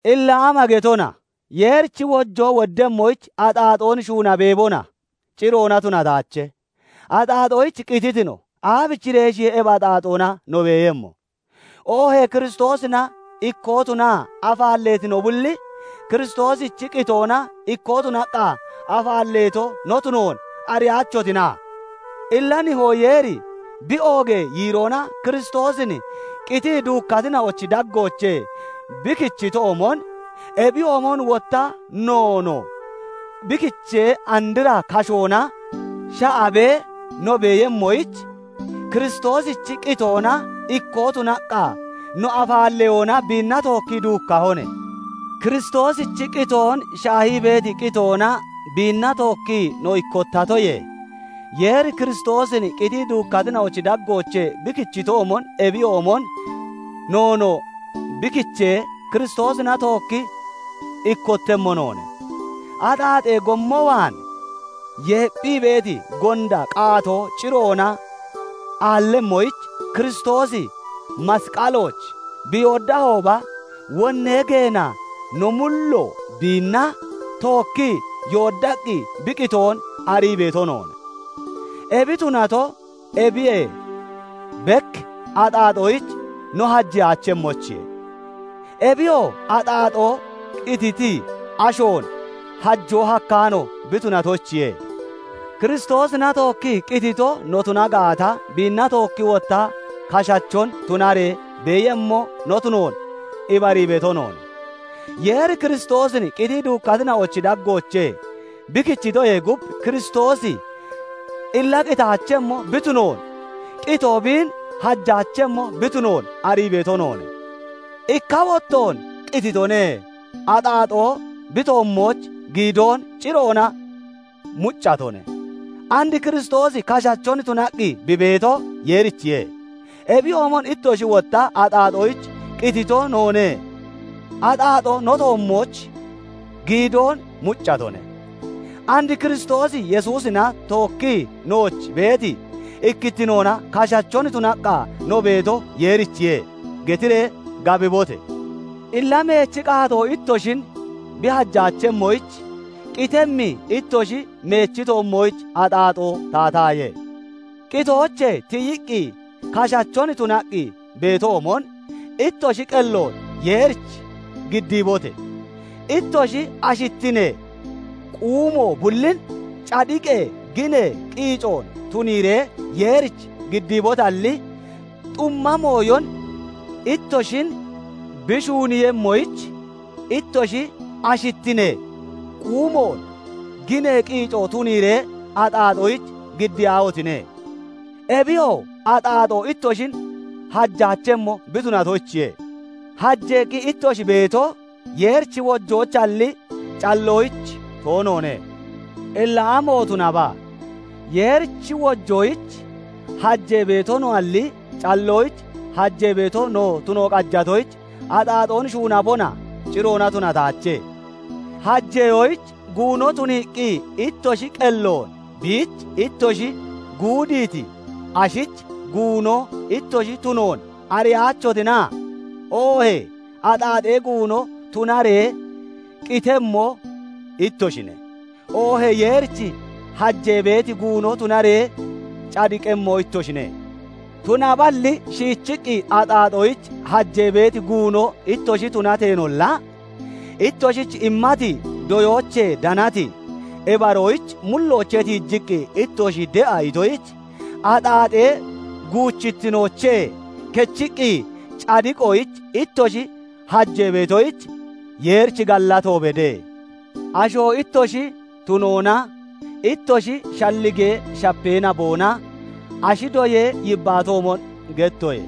Illa ama getona? Yeerichi wojoo woddemmoyich axaaxoon shuuna beebona? Ciroona tunataache. Axaaxoyich qititi no, aabichireeshiye ebi axaaxoona no beeyemmo? Oohee Kiristoosina ikkoo tunaa afaalleeti no bulli, Kiristoosichi qitoona ikkoo tunaqqa afaalleeto no tunoon ariyaachotina? Illa Nihoo Yeeri bi oogee yiiroona Kiristoosin qitii duukkatina'ochi daggoochee bi kichitoomon, ebiyoomon wotta noonoo bi kichee andra kashoona sha'abee no beeyemmoyich, Kiristoosichi qitoona ikkoo tunaqqa no afaalleyoona biinna tookkii duukkahone. Kiristoosichi qitoon shaahii beeti qitoona biinna tookkii no ikkottatoyee, Yeeri Kiristoosin qitii duukkatina'ochi daggoochee bi kichitoomon, ebiyoomon noonoo bi kichee, Kiristoosina tookki ikkottemmo noone. Axaaxee gommo waan yeepphii beeti gonda qaatoo ciroona aallemmoyich, Kiristoosi masqalooch bi yooddahooba, wonnee geena no mullo biinna tookkii yooddaqqi bi qitoon arii beeto noone; ebi tunato ebiyee bek axaaxoyich no hajeyaachemmoyichiye. Ebiyoo axaaxoo qititi ashoon hajoo hakkaano bi tunatoyichiye. Kiristoosina tookkii qitito no tuna gaata, biinna tookki wotta kashachon tunaree beeyemmo no tunoon ibarii beeto noone. Yeeri Kiristoosin qitii duukkatina'ochi daggoochee bi kichitoyee gub, Kiristoosi illa qitaachemmo bi tunoon, qitoo biin hajaachemmo bi tunoon arii beeto noone. Ikka wottoon qititone; axaaxoo bi toommooch giidoon ciroona muccatone; and Kiristoosi kashachon tunaqqi bi beeto Yeerichiye. Ebiyoomon ittoshi wotta "Axaaxoyich qitito noone; axaaxoo no toommooch giidoon muccatone; and Kiristoos Yesuusina tookkii nooch beeti ikkittinoona kashachon tunaqqa no beeto Yeerichiye" getiree gabibote! Illa meechi qaatoo ittoshin bi hajaachemmoyich, qitemmi ittoshi meechi toommooch axaaxoo taataaye. Qitoochee tiyiqqi kashachon tunaqqi beetoomon, ittoshi qelloon Yeerich giddiibote! Ittoshi ashittinee quumo bullin cadiqee ginee qiicoon tuniiree Yeerich giddiibotalli, xumma mooyon ittoshin bi shuuniiyemmoyich, ittoshi ashittinee quumoon ginee qiicoon tuniiree axaaxoyich giddiyaahotine! Ebiyoo axaaxoo ittoshin hajaachemmo bi tunatoyichiye; hajeeqqi ittoshi beeto Yeerichi wojoyichalli, calloyich toonoone. Illa amo tunaba? Yeerichi wojoyich hajee beeto noalli, calloyich hajee beeto tuno no qajatoyich, axaaxoon shuunabona? Ciroona tunataache. Hajeyoyich guuno tuniiqqi ittoshi qelloon biich ittoshi guudiiti ashich guuno ittoshi tunoon ariyaachotina? Oohee axaaxee guuno tunaree qitemmo ittoshine; oohee Yeerich hajee beeti guuno tunaree cadiqemmo ittoshine. Tunaballi shiichiqqi axaaxoyich hajee beeti guuno ittoshi tunateenolla, ittoshich immati doyoochee danati ibaroyich mulloochee tiijiqqi ittoshi de'a itoyich, axaaxee guuchittinoochee kechiqqi cadiqoyich ittoshi hajeetoyich, Yeerich gallato bede. Asho ittoshi tunoonaa ittoshi shalligee shapee naboona ashi doyee yibbaatoomon gettoye.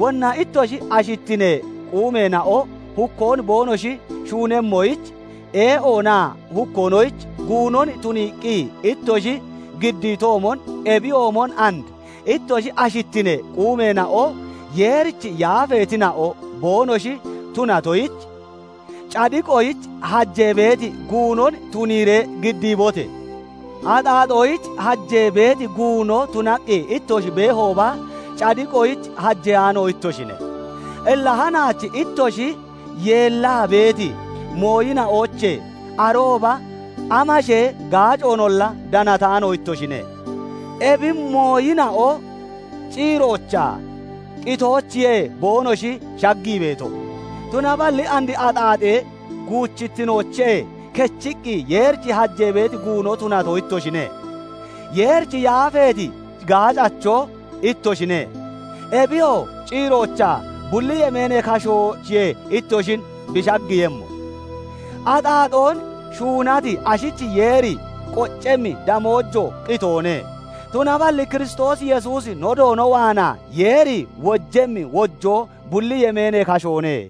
Wonna ittoshi ashittinee quumeena'o hukkoon boonoshi shuunemmoyich ee'oonaa hukkoonoyich guunon tuniiqqi ittoshi giddiitoomon, ebiyoomon and ittoshi ashittinee quumeena'o Yeerich yaafeetina'o boonoshi tunatoyich, cadiqoyich hajee beeti guunon tuniiree giddiibote! Axaaxoyich hajee beeti guuno tunaqqi ittoshi beehooba, cadiqoyich hajeyaano ittoshine. Illa hanaach ittoshi yeellaa beeti mooyina'oochee arooba amashee gaacoonolla danataano ittoshine. Ebi mooyina'o ciiroochaa qitoochiyee boonoshi shaggii beeto, Tunaballi and axaaxee guuchittinoochee kechiqqi Yeerich hajee beeti guuno tunato ittoshine; Yeerich yaafeeti gaacacho ittoshine; ebiyoo ciiroochaa bulli yemeenee kashoochiye ittoshin bi shaggiiyemmo. Axaaxoon shuunati ashich Yeeri qoccemmi damoojo qitoone; tunaballi Kiristoos Yesuusi no Doono waanaa Yeeri wojemmi wojoo bulli yemeenee kashoone.